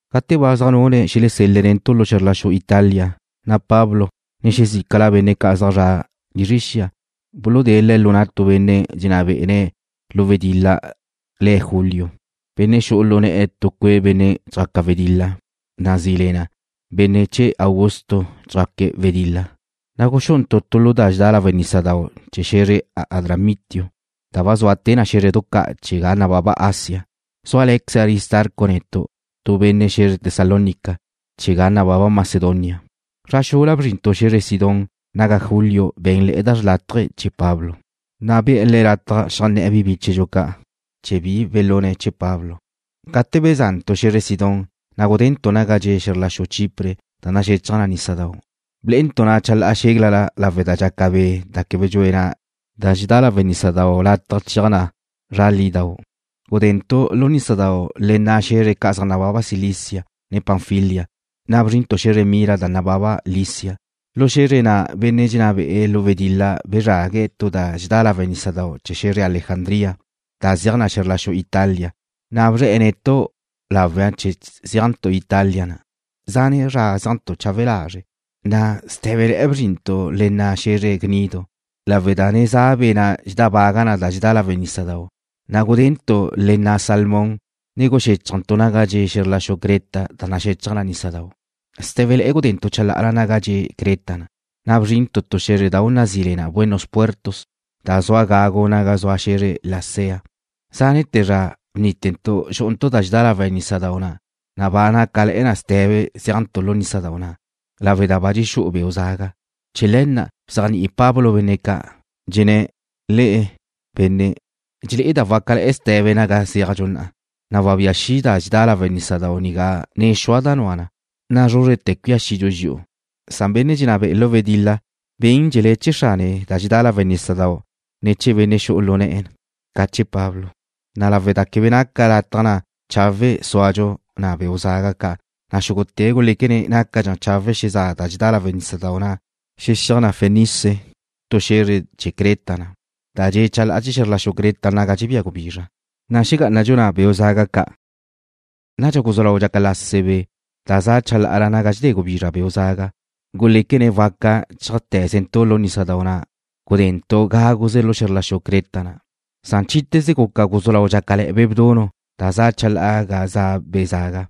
Gate ba zaj nune̱' xelesel-le̱' netu' lu xe̱zr la xu Italia, na' Pablo, ne xezícala benne' ca' zaj zre̱'e̱ lizre xia, buludée̱' le̱' lu na' tu benne' dxenná bé'ene̱ lu wedil-la le̱' Julio, benne' yu'u lu ne̱'e̱ tu cue' benne' dxjaque̱' wedil-la nazí le na Benne' Chee̱ Augusto Dxjaque̱' Wedil-la. Na' guxú'untu' tu lu da dxedá lawe' nísadau' chee̱ xe̱zre Adramitio, da ba zua te na xé̱zredu ca' chee̱ ga nababa Asia. Zúale̱queze Aristarco netu', tu benne' xe̱zre Tesalónica chee̱ ga nababa Macedonia. Zra xula bzrintu' xe̱zre Sidón, naga Julio bé̱nle̱'e̱ da chawe' chee̱ Pablo, na' be̱'e̱ le̱' lataj xeajnné̱'e̱ bi bíchedxu ca' chee̱ bi belune̱' chee̱'. Gate beza'ntu' xe̱zre Sidón, na' gudentu' naga dxe' xe̱zr la xu Chipre da naxechaj nísadau'. Blé'entu' na chalá'a xéglala lawe' da dxaca be' da quebe dxue na da dxedá lawe' nísadau' lataj cheaj na lizra lidau'. Gudentu' lu nísadau' le nna' xe̱zre ca' zaj nababa Cilicia, ne Panfilia, na' bzrintu' xe̱zre Mira da nababa Licia. Lu xe̱zre na' benne' dxenná be'e̱ lu wedil-la bezrague̱' tu da dxedá lawe' nísadau' chee̱ xe̱zre Alejandría da zeaj na xe̱zr la xu Italia, na' bzre̱'e̱ netu' lawle chee̱ zeajntu' Italia na'. Zane' zra zéajntu' chawe' lazre', na' sté̱bele̱'e̱ bzrintu' le nna' xe̱zre Gnido. Lawe' da ne za be' na' dxedábaga na da dxedá lawe' nísadau', na' gudentu' le nna' Salmón, ne guxéchajntu' naga dxe' xe̱zr la xu Creta da naxechaj nísadau'. Sté̱bele̱'e̱ gudentu' chalá'ala naga dxe' Creta na', na' bzrintu' tu xé̱zredau' nazí le na Buenos Puertos, da zua gagu naga zua xe̱zre Lasea. Záne'te̱ zra bnítentu' xu'untu' da dxedá lawe' nísadau' na', na' ba naca ste̱be zéajntu' lu nísadau' na' lawe' da ba dxexú'udxu beu' zaga. Chee̱ le̱ na' bzéajni'i Pablo benne' ca'. Dxenné̱': ―Le'e, benne', dxelé'eda' wácale̱'e̱ ste̱be naga zéajdxu na'a, na' wabía xi' da dxedá lawe' nísadau' nigá ne xua da nua na, na' zrúzrete̱ cuía xidxu dxi'u. Benne' dxenná be'e̱ lu wedil-la guxéajle̱dxe̱' chee̱ xrane da dxedá lawe' nísadau' na', ne chee̱ benne' xu'u na lu ne̱'e̱, ca chee̱ Pablo. Na' lawe' da quebe naca lataj na' chawe' súadxu na' beu' zaga ca', na' xúgute̱' guléquene̱' nácadxa chawe' xezá' da dxedá lawe' nísadau' na' chee̱ xexéaj na Fenice, tu xe̱zre chee̱ Creta na', da dxe' chalá'a chee̱ xe̱zr la xu Creta naga dxebía gubizra, na' xegá'anadxu na' beu' zaga ca'. Nadxa guzú lau dxaca lase be' da za' chalá'a naga dxedé gubizra beu' zaga, na' guléquene̱' waca chéajte̱zentu' lu nísadau', na' gudentu' gáguze lu xe̱zr la xu Creta na'. Nadxa chíte̱ze guca guzú lau dxácale̱'e̱ be' bdunu' da za' chalá'a ga za' be' zaga.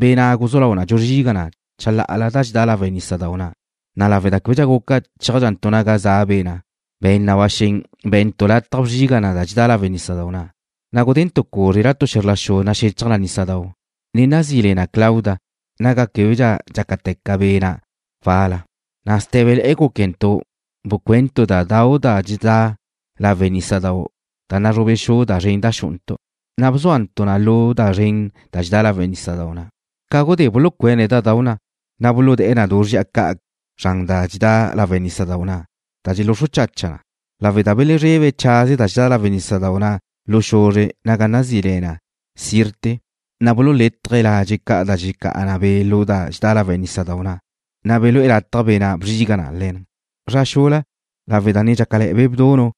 Be' na' guzú lau dxuzriga na chalá'ala da dxedá lawe' nísadau' na', na' lawe' da québedxa guca chéajdxantu' naga za' be' na' be̱n na ba xen be̱ntu' lataj bzriga na da dxedá lawe' nísadau' na'. Na' gudentu' cúzrela tu xe̱zr la xudau' naxechaj nísadau' da nazí le na Clauda, naga québedxa dxácate̱ na be' na' wal-la, na' sté̱bele̱'e̱ gúquentu' bcuentu' da dau' da dxedá lawe' nísadau' da nazrube xu da zren na' xu'untu', na' bzuantu' na lu da zren da dxedá lawe' nísadau' na'. Ca gudé bulucuene̱' da dau' na', na' buludée̱' du zri'a ca' zran da dxedá lawe' nísadau' na' da xeluxru chacha na. Nadxa, lawe' da belezrebe̱' chaze da dxedá lawe' nísadau' na' lu xuzre' naga nazí le Sirte, na' bululétaje̱' ladxe' ca' da dxelecá'a be' lu da dxedá lawe' nísadau' na', na' belúe lataj be' na' bzriga na le̱n. Zra xula, lawe' da ne dxácale̱'e̱ be' bdunu',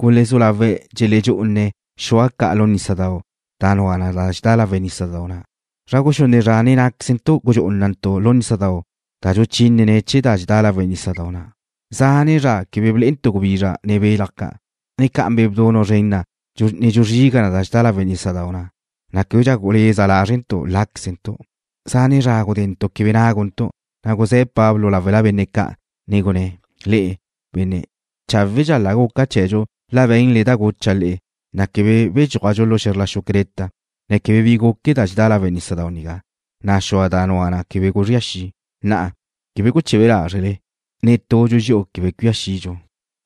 gulezú lawe̱' dxeledxú'une̱' xua ca' lu nísadau', da nua da dxedá lawe' nísadau' na'. Zra guxunne' zra nen ná'quezentu' gudxú'unantu' lu nísadau' da dxuluchínene̱' chee̱ da dxedá lawe' nísadau' na'. Zane' zra quebe blé'entu' gubizra ne belaj ca', ne ca naca be' bdunu' zren na' ne dxuzriga na da dxedá lawe' nísadau' na', na' québedxa guleza lázrentu' láquezentu'. Zane' zra gudentu' quebe náguntu', na' guzé̱ Pablo láwela benne' ca', ne gunné̱': ―Le'e, benne', cháwedxa la guca chee̱dxu la be̱nle da gucha' le'e, na' quebe bedxúajdxu lu xe̱zr la xu Creta, ne quebe bi guque da dxedá lawe' nísadau' nigá, na' xua' da nua na quebe guzría xi'. Na'a, quebe guchebe lázrele. Netudxu dxi'u quebe cuía xidxu,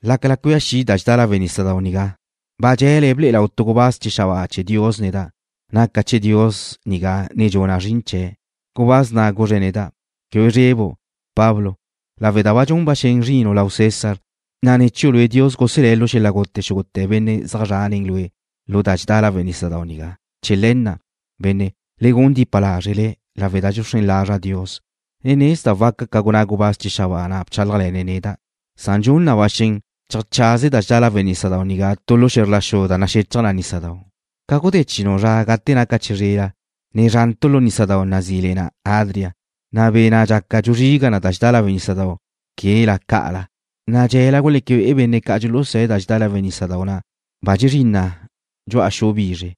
lácala cuía xi' da dxedá lawe' nísadau' nigá. Ba dxe̱le ble'e lau tu gubáz chee̱ xabáa chee̱ Dios neda'. Naca' chee̱ Dios nigá ne dxuna' zrin chee̱'. Gubáz na' guzre̱' neda': “Quebe zrebu', Pablo, lawe' da dxun na ba xen zrinu' lau César, na' ne̱ chiu' lue' Dios guselé̱' lu xel-la' gute xúgute̱ benne' zaj zra' nen lue' lu da dxedá lawe' nísadau' nigá.” Chee̱ le̱ na', benne', le gun dipa lázrele, lawe' da dxuxrén lazra' Dios, ne nezda' waca ca gunná gubáz chee̱ xabáa na' bchálajle̱ne̱' neda'. Na'a dxun na ba xen cheajchaze da dxedá lawe' nísadau' nigá tu lu xe̱zr la xu da naxechaj nísadau'. Ca gudé chinu' zra gate naca chizrela, ne zrantu' lu nísadau' nazí le na Adria, na' be' na' dxaca dxuzriga na da dxedá lawe' nísadau' quela ca'ala, na' dxe̱la guleque be'e benne' ca' dxulusá da dxedá lawe' nísadau' na' ba dxezrín na dxu'a xu bizre.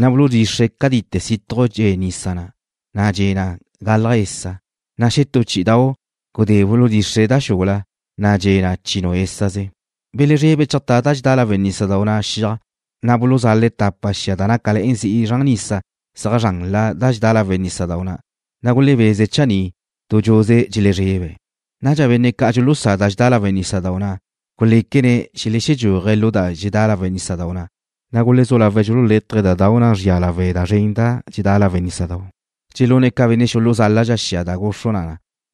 Na' buludxixre̱' cátite situj dxe' nisa na', na' dxe' na galaj esa. Na' xetú chí'idau' gudé buludxixre̱' da xula, na' dxe' na chinu' ésaze. Belezrebe̱' cheajtá da dxedá lawe' nísadau' na' xiaj, na' buluzale̱' tapa xia da nácale̱'e̱ zi'i zran nisa zeaj zranla da dxedá lawe' nísadau' na', na' gulebeze̱' chaní' dudxuze dxelezrebe̱'. Nadxa benne' ca' dxulusá da dxedá lawe' nísadau' na' guléquene̱' xelexedxúaje̱' lu da dxedá lawe' nísadau' na', na' gulezú lawe̱' dxululétaje̱' da dau' na' zria lawe' da zren na' dxedá lawe' nísadau', dxelune̱' ca benne' xuluzáladxa xia da guxru na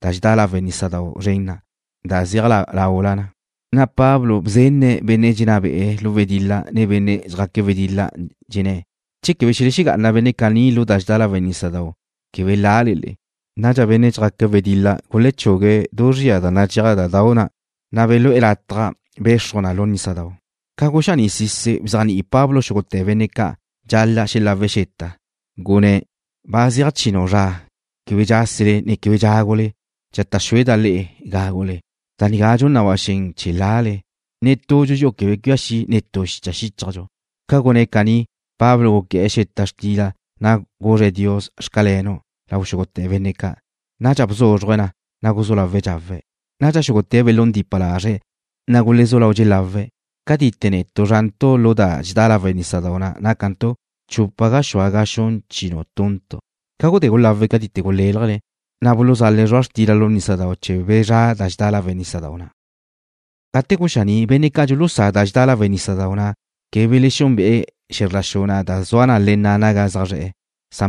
da dxedá lawe' nísadau' zren na' da zeaj laula na. Pablo bzenne̱' benne' dxenná be'e̱ lu wedil-la, ne benne' dxjaque̱' wedil-la, dxenné̱': ―Che quebe xelegá'ana benne' caní lu da dxedá lawe' nísadau', quebe lale le'e. Nadxa benne' dxjaque̱' wedil-la gulechugue̱' du zri'a da nadxéaj da dau' na', na' belú'e̱ na lataj bexruj na lu nísadau'. Ca guxaní'sise̱' bzéajni'i Pablo xúgute̱ benne' ca' dxal-la' xelawe̱' xeta, gunné̱': ―Ba zeaj chinu' zra quebe dxásele ne quebe dxágule. Dxata' xueda' le'e gágule. Da nigá dxun na ba xen chee̱ lale. Netudxu dxi'u quebe cuía xi' netú xicha xíchajdxu. Ca gunné̱' caní, Pablo guqué̱'e̱ tu xeta xtila, na' guzre̱' Dios: “Xcalenu'”, lau xúgute̱ benne' ca'. Nadxa bzúzruje̱' na, na' guzú lawe̱' dxawe̱'. Nadxa xúgute̱' belún dipa lazre̱', na' gulezú lau dxelawe̱'. Cátite netu' zrantu' lu da dxedá lawe' nísadau' na' nácantu' chupa gaxúa ga xun chinu tuntu'. Ca gudé gulawe̱' cátite guléljene̱', na' buluzale̱' zrua' xtila lu nísadau' chee̱ bezrá' da dxedá lawe' nísadau' na'. Gate guxaní', benne' ca' dxulusá da dxedá lawe' nísadau' na' quebe belexúnbe'e̱ xe̱zr la xu na' da zua na le nna' naga zaj zre̱'e̱.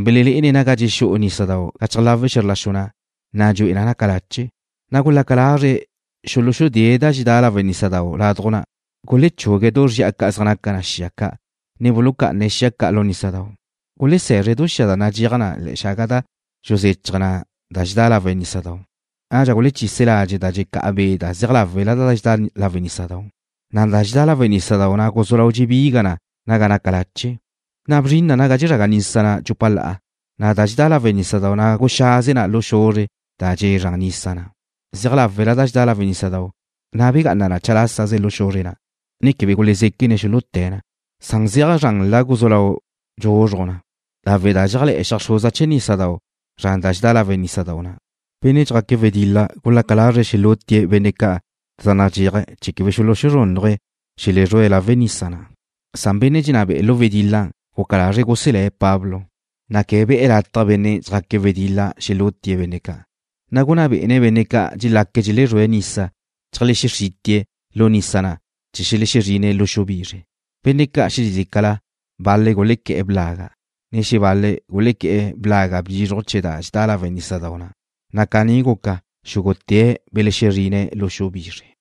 Belelé'ene̱' naga dxexú'u nísadau' gachaj láwela xe̱zr la xu na', na' dxu'e na' naca lache'. Na' gulaca lazre̱' xuluxudée̱' da dxedá lawe' nísadau' laduj na'. Gulechugue̱' du zri'a ca' zaj nacá'a xia ca', ne bulucá'ane̱' xia ca' lu nísadau'. Gulese̱zre̱' du zri'a da nadxéaj ne̱'e xaga da dxuzechaj na da dxedá lawe' nísadau'. Nadxa gulechise̱' ladxe' da dxecá'a be' da zeaj láwela da dxedá lawe' nísadau', na' da dxedá lawe' nísadau' na' guzú lau dxebiga na naga naca lache'. Bzrin na naga dxezraga nisa na' dxupa la'a, na' da dxedá lawe' nísadau' na' guxaze na lu xuzre' da dxe' zran nisa na'. Zeaj láwela da dxedá lawe' nísadau', na' begá'ana na chalásaze lu xuzre' na', ne québedxa gulezéquene̱' xuluté̱' na. Da zeaj zranla guzú lau dxuzruj na lawe' da dxeajé̱le̱'e̱ xeajxruza chee̱ nísadau' na' zran da dxedá lawe' nísadau' na'. Benne' dxjaque̱' wedil-la gulaca lazre̱' xelútie̱' benne' zaj nadxéaje̱' chee̱ quebe xuluxuzrúnnuje̱' xelezrúe̱' lawe' nisa na'. Benne' dxenná be'e̱ lu wedil-la guca lazre̱' guselé̱' Pablo, na' quebe be̱'e̱ lataj benne' dxjaque̱' wedil-la xelútie̱' benne' ca'. Na' gunná bé'ene̱' benne' ca' dxelaque̱' dxelezrúe̱' nisa cheajlexexrítie̱' lu nisa na' chee̱ xelexezrine̱' lu xu bizre. Benne' ca' xezícala, bal-le̱' gulequé̱'e̱ blaga', ne xebal-le̱' gulequé̱'e̱ blaga' bizruj chee̱ da dxedá lawe' nísadau' na', na' caní guca, xúgute̱' belexezrine̱' lu xu bizre.